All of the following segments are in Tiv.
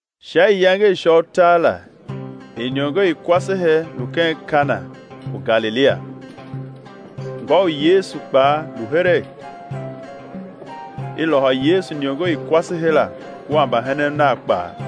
Sha iyange i sha utar la iniongo i kwasehe lu ken Kana u Galilia; ngô u Yesu kpaa lu heregh. I lôhô Yesu iniongo i kwasehe la kua mbahenen Nav kpaa.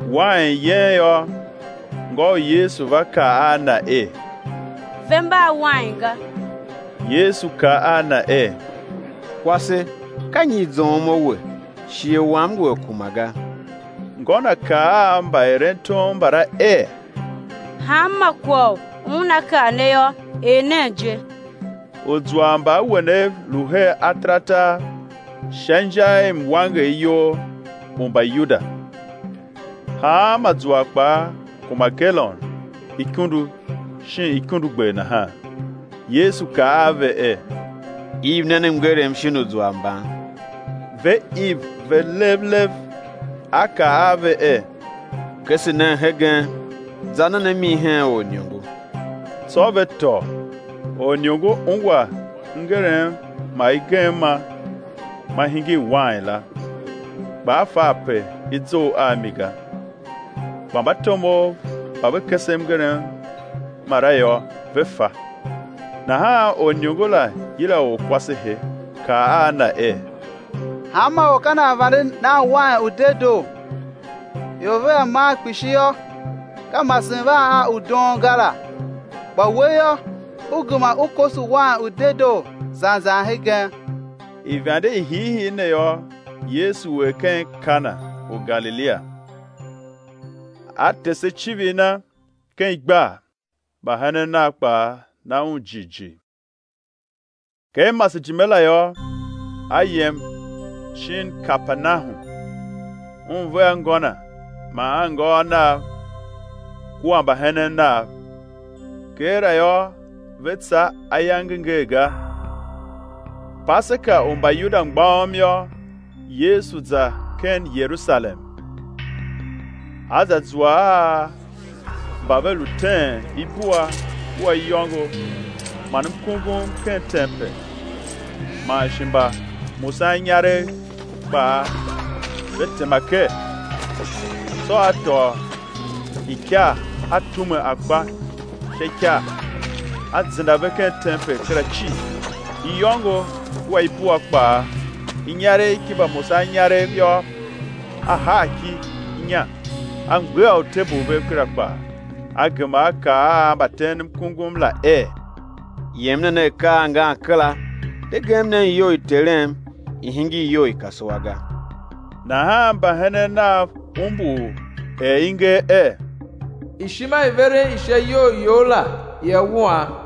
Wain yen yô, ngô u Yesu va kaa a Na er: Ve mba a wain ga. Yesu kaa a na er: Kwase, ka nyi i zoughom a we? Shighe Wam ngu a kuma ga. Ngô Na kaa a mbaerentom mbala er: Hanma kwagh u Una kaa ne yô, er nen je. Uzwar mba awenev lu her ataratar sha inja i mwangeryol u Mbayuda, hanma zwar kpaa kuma galon ikundu shin ikundugber nahan. Yesu kaa a ve er: Iv nen mngerem shin uzwar mban. Ve iv ve lev lev. A kaa a ve er: Kese nen hegen, za nen a mi hen oriniongo; tsô ve tôô. Oriniongo ungwa mngerem ma i gem ma ma hingir wain la, kpa a fa ape i zough a mi ga (kpa mbatomov mba ve kese mngerem mala yô ve fa), nahan oriniongo la yila orkwasehe, kaa a na er: Hanma or ka nan vande nan wain u dedoo, ior vea man kpishi yô, ka masen van a u doon ga la; kpa we yô, u gema u koso wain u dedoo zan zan hegen. Ivande i hiihii ne yô, Yesu er ken Kana u Galilia, A tese icivir Na ken igbar; mbahenen Nav kpaa na Un jighjigh. Ken masejime la yô, a yem shin Kapernahum, Un vea ngô Na man anngôôv Nav, kua mbahenen Nav; keela yô ve tsa ayange ngee ga. Paseka u Mbayuda mgbôghom yô, Yesu za ken Yerusalem. A za zua a mba ve lu teen ibua kua iyôngo man mkungum ken tempel, man shi mbamusaninyaregh kpaa ve tema ker. Tsô A tôô ikar A tume akpa sha ikar, A zenda ve ken tempel kera cii, iyôngo kua ibua kpaa; inyaregh ki mbamusaninyaregh yô, A haa ki inya. A mgbegha utebul vev kera kpaa. A gema A kaa a mbateenmkungum la er: Yem nen a akaa angan kera, de gem nen iyou i Terem, i̱ hingir iyou i kasua ga. Nahan mbahenen Nav umbur er i nger er: Ishima i veren i sha iyou You la ia wuam.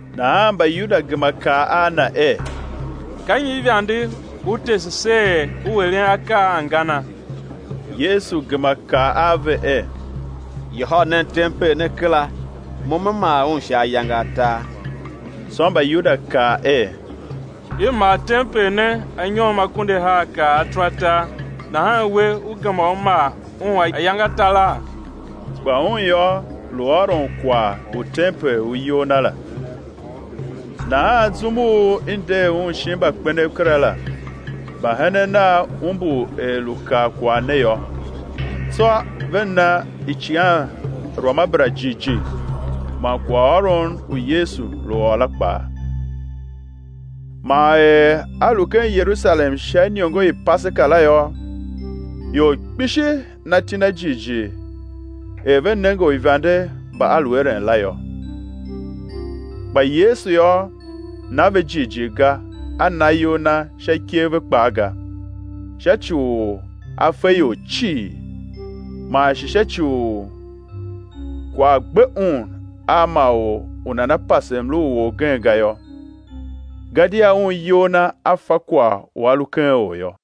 Nahan Mbayuda gema kaa a Na er: Ka nyi ivande U tese se er U eren akaa a angana? Yesu gema kaa a ve er: Yôhôl nen tempel ne kera, Mo Me maa un sha ayange atar. Tsô Mbayuda kaa er: I maa tempel ne anyom akunduahar kar ataratar, nahan We, Ú gema Ú maa un ayange ataraa? Kpa Un yô, lu ôron kwagh u tempel u iyol Na la. Nahan zum u i nder Un shin mbakpenev kera la, mbahenen nav umbur er lu kaa kwagh ne yô. Tsô ve na icighanruamabera jighjigh man kwaghôron u Yesu lu ôr la kpaa. Man er A lu ken Yerusalem sha iniongo i Paseka la yô, ior kpishi na iti Na jighjigh er ve nenge uivande mba A lu eren la yô. Kpa Yesu yô, na ve jighjigh ga A na iyol Na sha ikev ve kpaa ga, sha ci u A fe ior cii, man shi sha ci u kwagh gbe Un a ma or u nana pase mlu u orgen ga yô, gadia Un iyol Na A fa kwagh u a lu ken or yô.